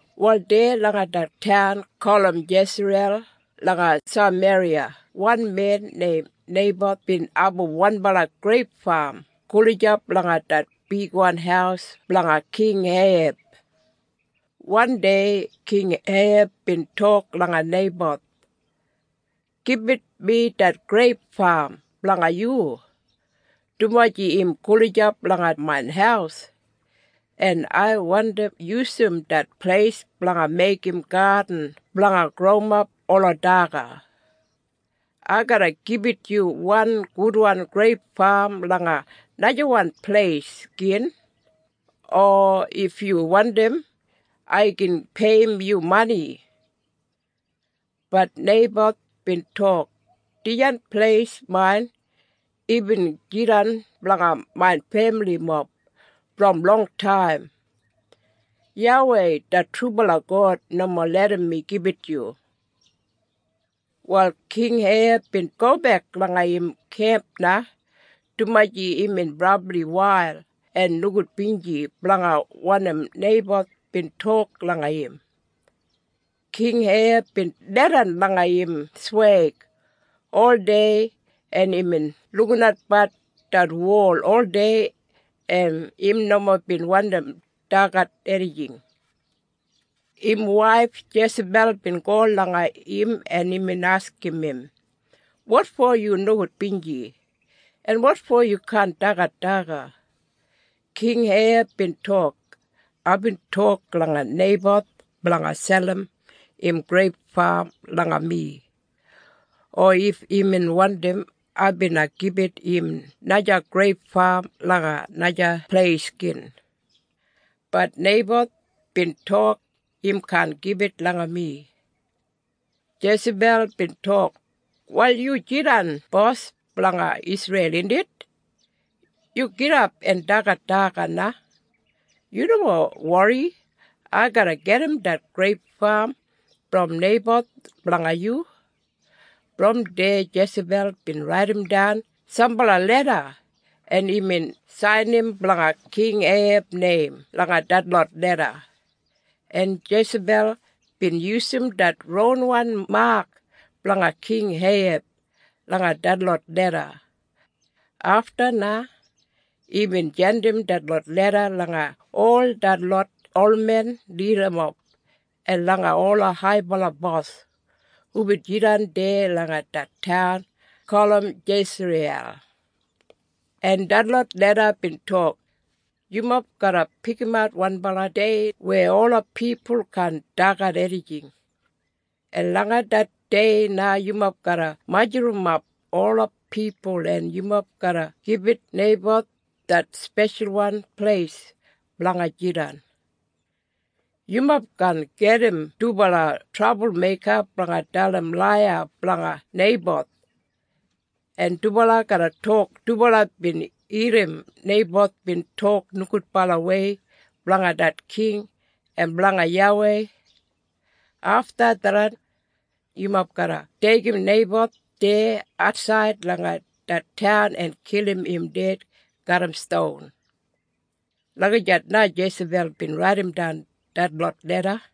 Wal deya langa det taun gulum Jesriyel langa Sameriya wan men neim Neiboth bin abum wanbala greip fam gulijap langa det bigwan haus blanga King Eiheb. Wandei King Eiheb bin tok langa Neiboth, “Gibit mi det greip fam blanga yu, dumaji im gulijap langa main haus, en ai wandi yusum det pleis blanga meigim gadin blanga growimap ola daga. Ai garra gibit yu wan gudwan greip fam langa najawan pleis gin, o if yu wandim, ai gin peiyim yu mani.” Bat Neiboth bin tok, “Dijan pleis main. Imbin jidan blanga main femilimob brom longtaim. YAWEI det trubala God nomo larram mi gibit yu.” Wal King Eiheb bin gobek langa im kemp na, dumaji imbin brabli wail en nogudbinji blanga wanim Neiboth bin tok langa im. King Eiheb bin leidan langa im sweig oldei en imbin lukinatbat det wol oldei en im nomo bin wandim dagat enijing. Im waif Jesabel bin go langa im en imbin askim im, “Wotfo yu nogudbinji? En wotfo yu kaan dagat daga?” King Eiheb bin tok, “Aibin tok langa Neiboth blanga selim im greip fam langa mi, o if imbin wandim ai bina gibit im naja greip fam langa naja pleis gin. Bat Neiboth bin tok im kaan gibit langa mi.” Jesabel bin tok, “Wal yu jidan bos blanga Isreil indit? Yu gidap en dagat daga na. Yu nomo wori. Ai garra gedim det greip fam brom Neiboth blanga yu.” Brom deya Jesabel bin raidimdan sambala leda en imbin sainim blanga King Eiheb neim langa detlot leda. En Jesabel bin yusum det ronwan mak blanga King Eiheb langa detlot leda. Afta na, imbin jandim detlot leda langa ol detlot olmen lidamob en langa ola haibala bos hubin jidan deya langa det taun gulum Jesriyel. En detlot leda bin tok, “Yumob garra pikimat wanbala dei weya ola pipul kaan dagat enijing. En langa det dei na yumob garra majurrumap ola pipul en yumob garra gibit Neiboth det speshalwan pleis blanga jidan. Yumob garra gajim dubala trabulmeika blanga dalim laiya blanga Neiboth en dubala garra tok dubala bin irrim Neiboth bin tok nogudbalawei blanga det king en blanga YAWEI. Afta tharran, yumob garra deigim Neiboth deya atsaid langa det taun en kilim im ded garram ston.” Lagijat na Jesabel bin raidimdan detlot leda.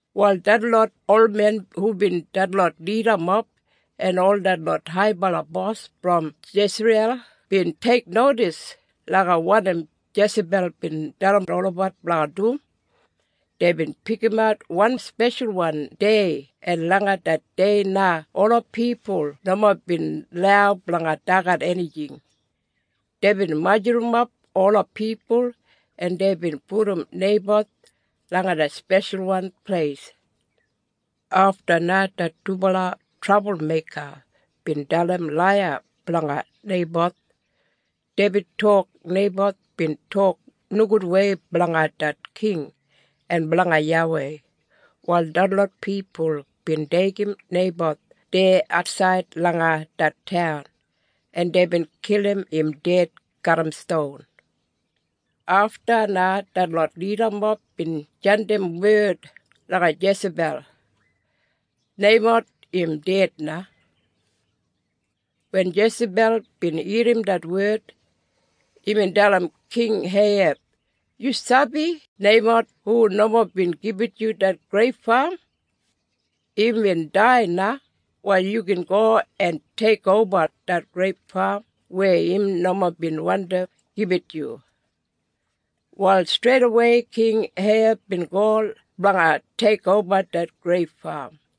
Wal detlot olmen hubin detlot lidamob en ol detlot haibala bos brom Jesriyel bin teiknodis langa wanim Jesabel bin dalim olabat blanga dum. Deibin pikimat wan speshalwan dei en langa det dei na ola pipul nomo bin lau blanga dagat enijing. Deibin majurrumap ola pipul en deibin pudum Neiboth langa det speshalwan pleis. Afta na det dubala trabulmeika bin dalim laiya blanga Neiboth. Deibin tok Neiboth bin tok nogudwei blanga det king en blanga YAWEI. Wal detlot pipul bin deigim Neiboth deya atsaid langa det taun, en deibin kilim im ded garram ston. Afta na detlot lidamob bin jandim wed langa Jesabel, “Neiboth im ded na.” Wen Jesabel bin irrim det wed, imbin dalim King Eiheb, “Yu sabi Neiboth hu nomo bin gibit yu det greip fam? Imbin dai na. Wal yu gin go en teikoba det greip fam weya im nomo bin wandi gibit yu.” Wal streidawei King Eiheb bin go blanga teikoba det greip fam.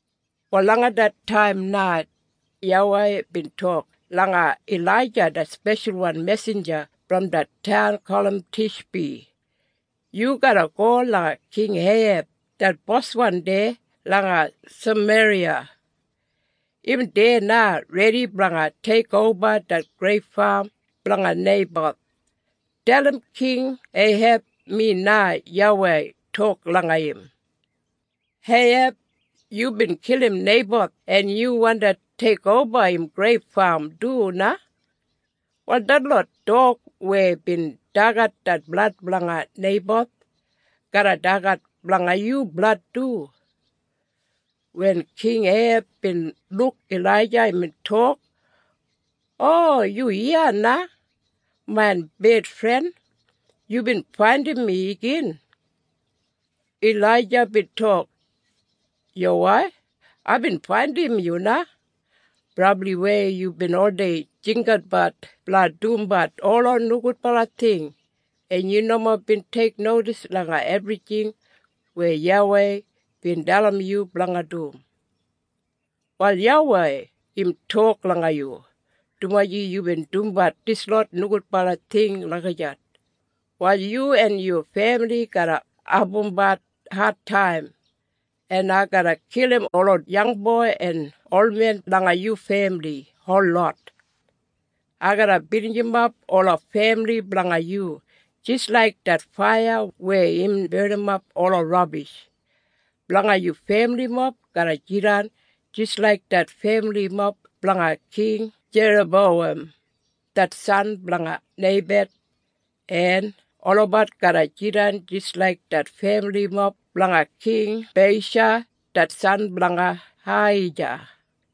Wal langa det taim na, YAWEI bin tok langa Ilaija det speshalwan mesinja brom det taun gulum Tishbi, “Yu garra go langa King Eiheb det boswan deya langa Sameriya. Im deya na redi blanga teikoba det greip fam blanga Neiboth. Dalim King Eiheb mi na YAWEI tok langa im, ‘Eiheb! Yubin kilim Neiboth en yu wandi teikoba im greip fam du na? Wal, detlot dog weya bin dagat det blad blanga Neiboth, garra dagat blanga yu blad du.’” Wen King Eiheb bin luk Ilaija imbin tok, “O, yu iya na! Main bedfren, yubin faindim mi igin!” Ilaija bin tok, “Yuwai, aibin faindim yu na! Brabliwei yubin oldei jinggabat blanga dumbat ola nogudbala ting en yu nomo bin teiknodis langa ebrijing weya YAWEI bin dalim yu blanga dum. Wal YAWEI im tok langa yu, ‘Dumaji yubin dumbat dislot nogudbala ting lagijat, wal yu en yu femili garra abumbat adtaim en ai garra kilim ola yangboi en olmen langa yu femili holot. Ai garra binijimap ola femili blanga yu, jis laik det faiya weya im barnimap ola rabish. Blanga yu femilimob garra jidan jis laik det femilimob blanga King Jerabowam det san blanga Neibat, en olabat garra jidan jis laik det femilimob blanga King Beisha det san blanga Ahija,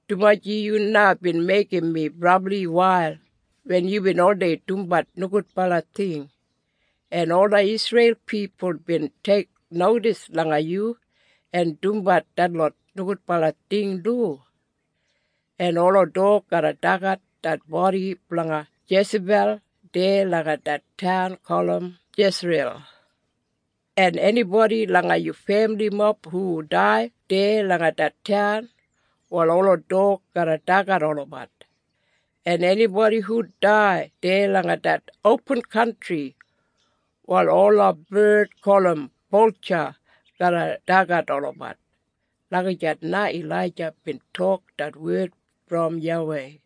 dumaji yu na bin meigim mi brabli wail wen yubin oldei dumbat nogudbala ting en ola Isreil pipul bin teiknodis langa yu en dumbat detlot nogudbala ting du. En ola dog garra dagat det bodi blanga Jesabel deya langa det taun gulum Jesriyel. En enibodi langa yu femilimob hu dai deya langa det taun, wal ola dog garra dagat olabat, en enibodi hu dai deya langa det opin kantri, wal ola bard gulum boltja garra dagat olabat.’” Lagijat na Ilaija bin tok det wed brom YAWEI.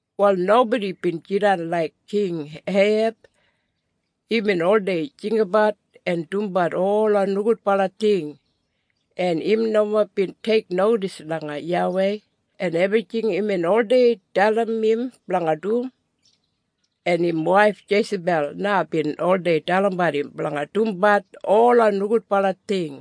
Wal nobodi bin jidan laik King Eiheb. Imbin oldei jinggabat en dumbat ola nogudbala ting en im nomo bin teiknodis langa YAWEI en ebrijing imbin oldei dalim im blanga dum. En im waif Jesabel na bin oldei dalimbat im blanga dumbat ola nogudbala ting.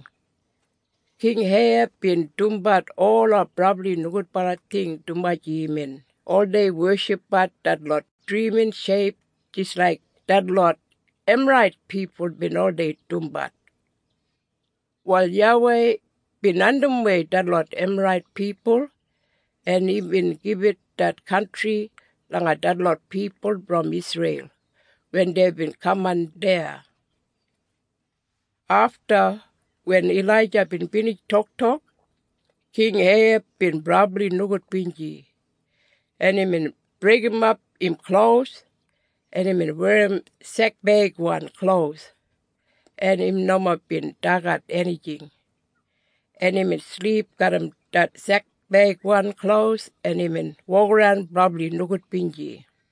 King Eiheb bin dumbat ola brabli nogudbala ting dumaji imbin oldei weshipbat detlot drimin sheip jis laik detlot Emarait pipul bin oldei dumbat. Wal YAWEI bin andimwei detlot Emarait pipul en imbin gibit det kantri langa detlot pipul brom Isreil wen deibin kaman deya. Afta, wen Ilaija bin binij toktok, King Eiheb bin brabli nogudbinji en imbin breigimap im klos en imbin werrim sekbeigwan klos en im nomo bin dagat enijing, en imbin silip garram det sekbeigwan klos en imbin wokaran brabli nogudbinji.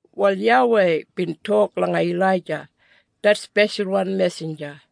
Wal YAWEI bin tok langa Ilaija, det speshalwan mesinja,